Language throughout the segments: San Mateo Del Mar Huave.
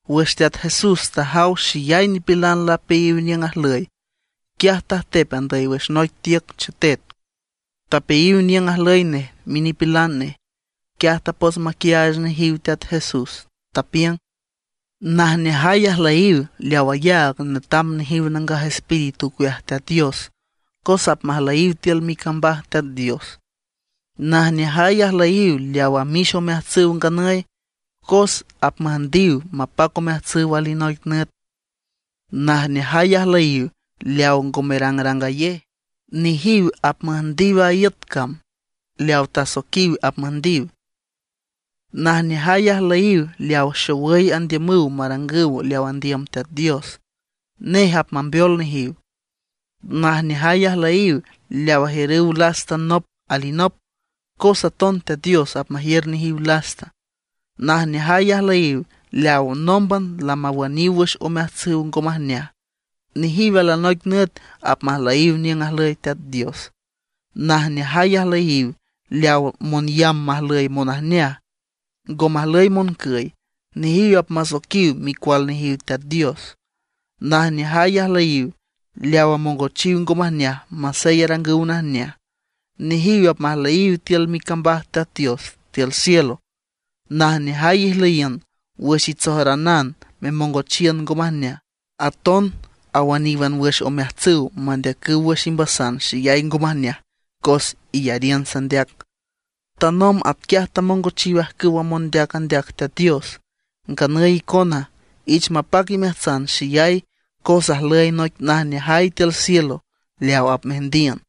Wüx Teat Jesús tajaw xeyay nipilan lapeayiw niüng ajlüy, quiaj tajtep andüy wüx noic tiüc chetet. Tapeayiw niüng ajlüy nej minipilan nej. Quiaj tapots maquiaach nejiw Teat Jesús, tapiüng: ―Najneajay ajlüyiw leaw ayaag netam nejiw Nangaj Espíritu ocueaj Teat Dios, cos apmajlüyiw tiül micambaj Teat Dios. ’Najneajay ajlüyiw leaw amix omeajtsüw nganüy, cos apmüjndiw mapac omeajtsüw alinoic nüt. ’Najneajay ajlüyiw leaw ngo merangrangayej; nejiw apmüjndiw a iüt cam leaw tasoiquiw apmüjndiw. ’Najneajay ajlüyiw leaw xowüy andiümüw marangüw leaw andiüm Teat Dios, nej apmambeol nejiw. ’Najneajay ajlüyiw leaw ajiürüw lasta nop alinop, cos aton Teat Dios apmajiür nejiw lasta. ’Najneajay ajlüyiw leaw nómban lamawüniw wüx omeajtsüw ngo majneaj; nejiw alinoic nüt apmajlüyiw niüng ajlüy Teat Dios. ’Najneajay ajlüyiw leaw monyamb majlüy monajneaj, ngo majlüy moncüy, nejiw apmasoiquiw micual nejiw Teat Dios. ’Najneajay ajlüyiw leaw amongochiw ngo majneaj masey arangüw najneaj; nejiw apmajlüyiw tiül micambaj Teat Dios tiül cielo. ’Najneajay ijlüyiün wüx itsojaranan memongochiün ngo majneaj. Aton awüníwan wüx omeajtsüw mandeacüw wüx imbasan xeyay ngo majneaj cos iyariün sandeac. Tanomb atquiaj tamongochiw ajcüwa mondeac andeac Teat Dios. Nganüy icona, ich mapac imeajtsan xeyay cos ajlüy noic najneajay tiül cielo leaw apmeajndiün.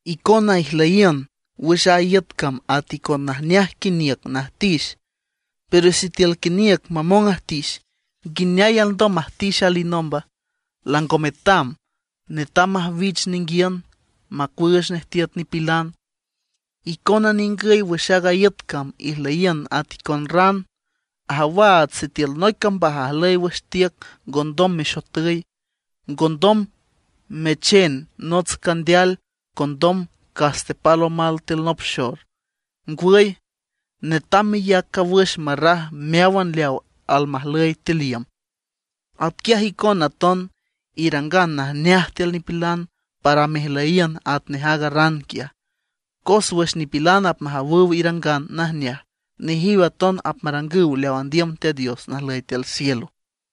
’Icona ijlüyiün wüx a iüt cam at icon najneaj quiniüc najtix. Pero sitiül quiniüc mamong ajtix, ¿nguineay alndom majtix alinomba? Lango metam, netam majwich ninguiün macuüüch nej tiüt nipilan. ’Icona ningüy wüx aaga iüt cam ijlüyiün at icon ran. Ajawaats sitiül noic cambaj ajlüy wüx tiüc ngondom mexotüy. Ngondom mechen nots candeal condom cas tepal omal tiül nop xor. Ngwüy, netam meyac cawüx marraj meáwan leaw almajlüy tiül iüm. Atquiaj icona aton, irangan najneaj tiül nipilan para mejlüyiün atnej aaga ran quiaj; cos wüx nipilan apmajawüw irangan najneaj, nejiw aton apmarangüw leaw andiüm Teat Dios najlüy tiül cielo.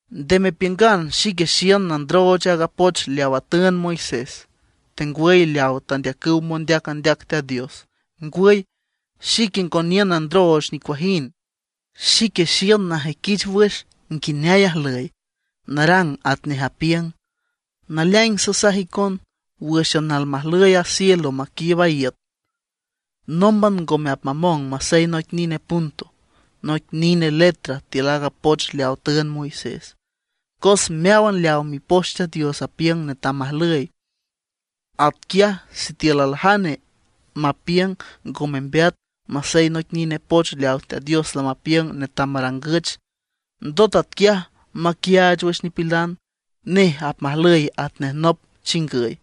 ’Nde mepiüngan xique xiün nandrooch aaga poch leawa tüünd Moisés, tengwüy leaw tandeacüw mondeac andeac Teat Dios. Ngwüy, xique ngo niün nandrooch nicuajind. Xique xiün najüiquich wüx nguineay ajlüy, narang atnej apiüng. Naleaing sasaj icon, wǘxan almajlüy a cielo maquiiüb a iüt, nómban ngome apmamong masey noic nine punto, noic nine letra tiül aaga poch leawa tüünd Moisés, cos meáwan leaw Mipoch Teat Dios apiüng netam majlüy. Atquiaj sitiül aljane mapiüng ngo membeat masey noic nine poch leaw Teat Dios lamapiüng netam marangüch, ndot atquiaj maquiaach wüx nipilan, nej apmajlüy at nej nop chingüy,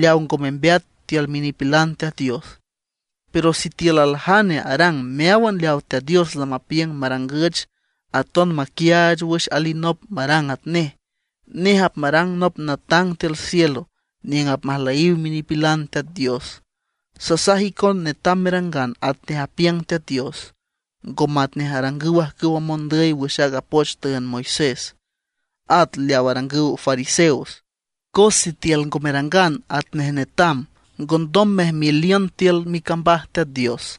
leaw ngo membeat tiül minipilan Teat Dios. Pero sitiül aljane arang meáwan leaw Teat Dios lamapiüng marangüch, aton maquiaach wüx alinop marang atnej; nej apmarang nop natang tiül cielo niüng apmajlüyiw minipilan Teat Dios. Sasaj icon netam merangan atnej apiüng Teat Dios, ngo matnej arangüw ajcüwa mondüy wüx aaga poch tüünd Moisés, at leaw arangüw fariseos; cos sitiül ngo merangan atnej netam ngondom mejmeliün tiül micambaj Teat Dios.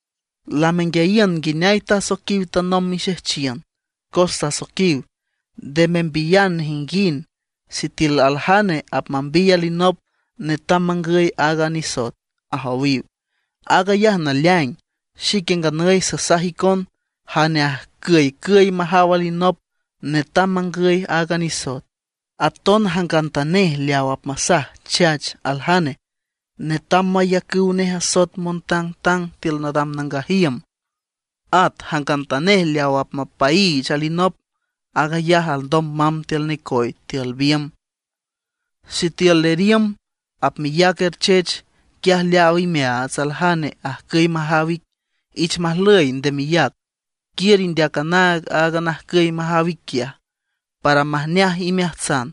’Lamenguiayiün nguineay tasoiquiw tanomb mixejchiün, cos tasoiquiw: “Nde membiyan nejinguind, sitiül aljane apmambiy alinop netam mangüy aaga nisoet”, ajowiw. Aag ayaj naleaing, xique nganüy sasaj icon, jane ajcüycüy majaw alinop netam mangüy aaga nisoet. Aton jangantanej leaw apmasaj chach aljane, netam mayacüw nej asoet montangtang tiül nadam nangaj iüm. At jangantanej leaw apmapaiich alinop, aag ayaj alndom mamb tiül necoy tiül biümb. ’Sitiül leriümb apmeyac erchech, quiaj leaaw imeaats aljane ajcüy majaw ic, ich majlüy, nde meyac. Quiür indeac anaag aaga najcüy majaw ic quiaj, para majneaj imeajtsan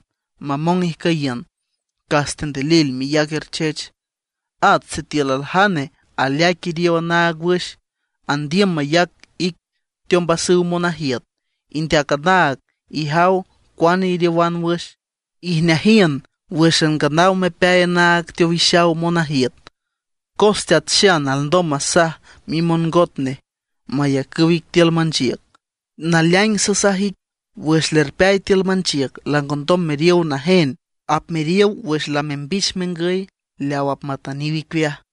mamong ijcüyiün, cas tendilil meyac erchech. ’At sitiül aljane aleaic iriow anaag wüx, andiüm mayac ic teombasüw monajiüt, indeac anaag, ijaw cuane iriowan wüx, ijneajiün wǘxan nganaw mepeay anaag teowixaw monajiüt, cos teat xan alndom masaj mimongot nej mayacüw ic tiül manchiüc. Naleaing sasaj ic, wüx lerpeay tiül manchiüc langondom meriow najen, apmeriow wüx lamembich mengüy leaw apmatüniw icueaj.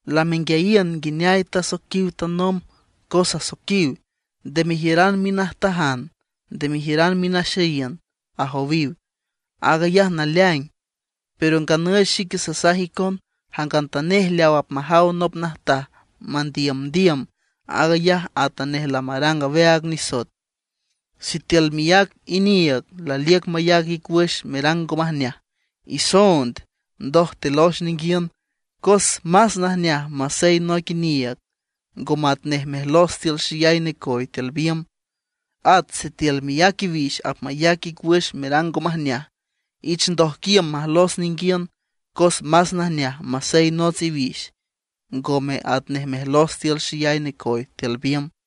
’Lamenguiayiün nguineay tasoiquiw tanomb, cos asoiquiw: “Nde mejiüran minajtajan, nde mejiüran minaxeyiün”, ajowiw. Aag ayaj naleaing. Pero nganüy xique sasaj icon jangantanej leaw apmajaw nop najtaj mandiümdiüm, aag ayaj atanej lamarang aweaag nisoet. ’Sitiül miác iniiüg laliüc mayac ic wüx merang ngo majneaj, isoond, ndoj telox ninguiün; cos más najneaj masey noic iniiüg, ngome atnej mejlos tiül xeyay necoy tiül biümb. At sitiül miác iwix apmayac ic wüx merang ngo majneaj, ich ndojquiüm majlos ninguiün; cos más najneaj masey nots iwix, ngome atnej mejlos tiül xeyay necoy tiül biümb.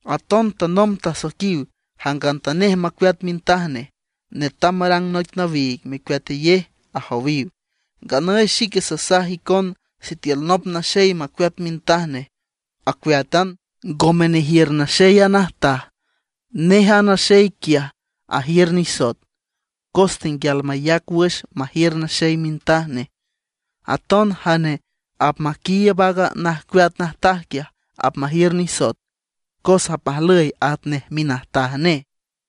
’Aton tanomb tasoiquiw: “Jangantanej macueat mintaj nej, netam marang noic nawiig mecueatayej”, ajowiw. Nganüy xique sasaj icon sitiül nop naxey macueat mintaj nej, acueátan, ngome nejiür naxey a najtaj; nej a naxey quiaj ajiür nisoet, cos tenguial mayac wüx majiür naxey mintaj nej. Aton jane apmaquiiüb aaga najcueat najtaj quiaj, apmajiür nisoet, cos apmajlüy atnej minajtaj nej.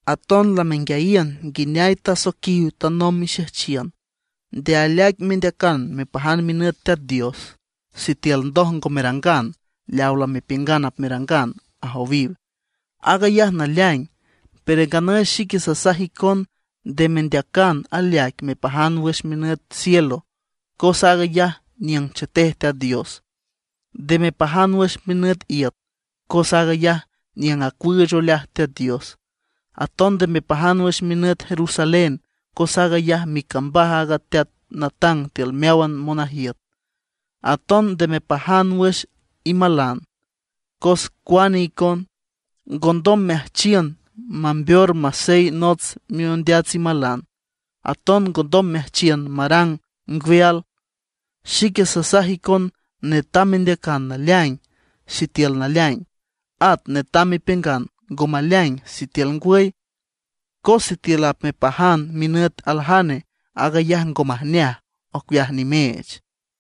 ’Aton lamenguiayiün nguineay tasoiquiw tanomb mixejchiün: “Nde aleaic mendeacan mepajan minüt Teat Dios sitiül ndoj ngo merangan leaw lamepiüngan apmerangan”, ajowiw. Aag ayaj naleaing. Pero nganüy xique sasaj icon nde mendeacan aleaic mepajan wüx minüt cielo cos aag ayaj niüng chetej Teat Dios. Nde mepajan wüx minüt iüt, cos aag ayaj niüng acuüüch oleaj Teat Dios. Aton nde mepajan wüx minüt Jerusalén cos aag ayaj micambaj aaga Teat natang tiül meáwan monajiüt. Aton nde mepajan wüx imalan, cos cuane icon, ngondom meajchiün mambeor masey nots miondeats imalan, aton ngondom meajchiün marang ngweal. Xique sasaj icon netam mendeacan “naleaing” sitiül naleaing, at netam mepiüngan “ngo maleaing” sitiül ngwüy. Cos sitiül apmepajan minüt aljane, aag ayaj ngo majneaj, ocueaj nimeech.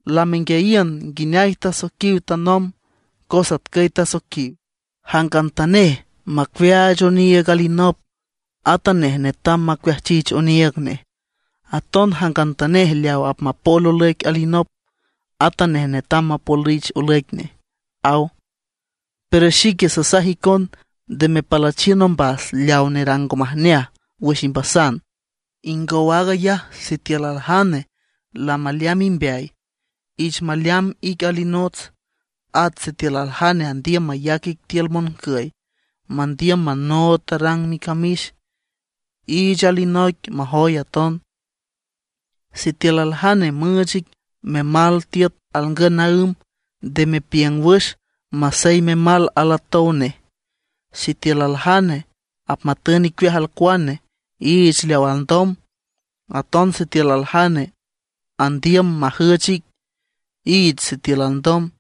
’Lamenguiayiün nguineay tasoiquiw tanomb, cos atcüy tasoiquiw: “Jangantanej macuiaach oniiüg alinop, atanej netam macuiajchich oniiüg nej. Aton jangantanej leaw apmapol olüic alinop, atanej netam mapolich olüic nej”, aw. Pero xique sasaj icon, nde mepalüchiün ombas leawa nerang ngo majneaj wüx imbasan. Ingow aag ayaj sitiül aljane lamaleamb imbeay, iich maleamb ic alinots. At sitiül aljane andiüm mayac ic tiül moncüy, mandiüm manood tarrang micamix, iich alinoic majoy aton. Sitiül aljane müüch ic memal tiüt alngün naǘm, nde mepiüng wüx masey memal alatownej. Sitiül aljane apmatün icueaj alcuane, iich leaw alndom. Aton sitiül aljane andiüm majüch ic, iich sitiül alndom.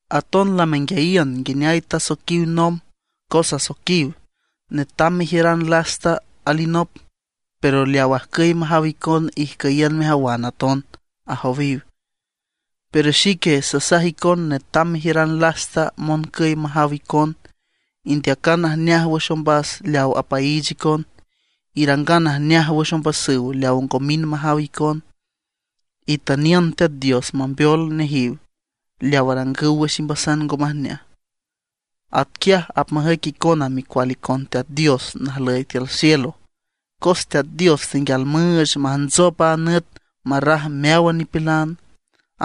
’Aton lamenguiayiün nguineay tasoiquiw nomb, cos asoiquiw: “Netam mejiüran lasta alinop, pero leaw ajcüy majaw icon ijcüyiün mejawan aton”, ajowiw. Pero xique sasaj icon netam mejiüran lasta moncüy majaw icon. Indeacan najneaj wüx ombas leaw apaiich icon; irangan najneaj wüx ombasüw leaw ngo mind majaw icon. Itüniün Teat Dios mambeol nejiw leaw arangüw wüx imbasan ngo majneaj. Atquiaj apmajüic icona micual icon Teat Dios najlüy tiül cielo. Cos Teat Dios tenguial müüch majntsop a nüt marraj meáwan nipilan;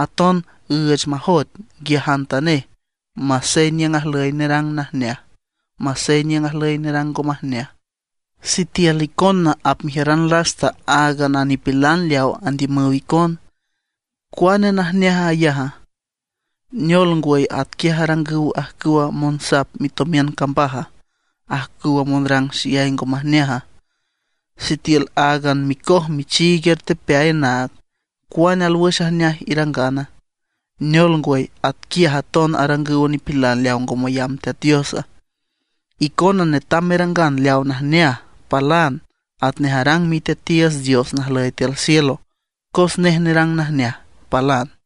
aton üüch majoet nguiajantanej masey niüng ajlüy nerang najneaj, masey niüng ajlüy nerang ngo majneaj. Sitiül icona apmejiüran lasta áagan a nipilan leaw andiümüw icon, ¿cuane najneaj aag ayaja? ¿Neol ngwüy atquiaj arangüw ajcüwa monsap mitomiün cambaja, ajcüwa monrang xeyay ngo majneaja? Sitiül áagan micoj michiig ertepeay anaag, ¿cuane alwüx ajneaj irangana? ¿Neol ngwüy, atquiaj aton arangüw nipilan leaw ngo mayamb Teat Dios? Icona netam merangan leaw najneaj, palan, atnej arang Miteatiiüts Dios najlüy tiül cielo, cos nej nerang najneaj, palan.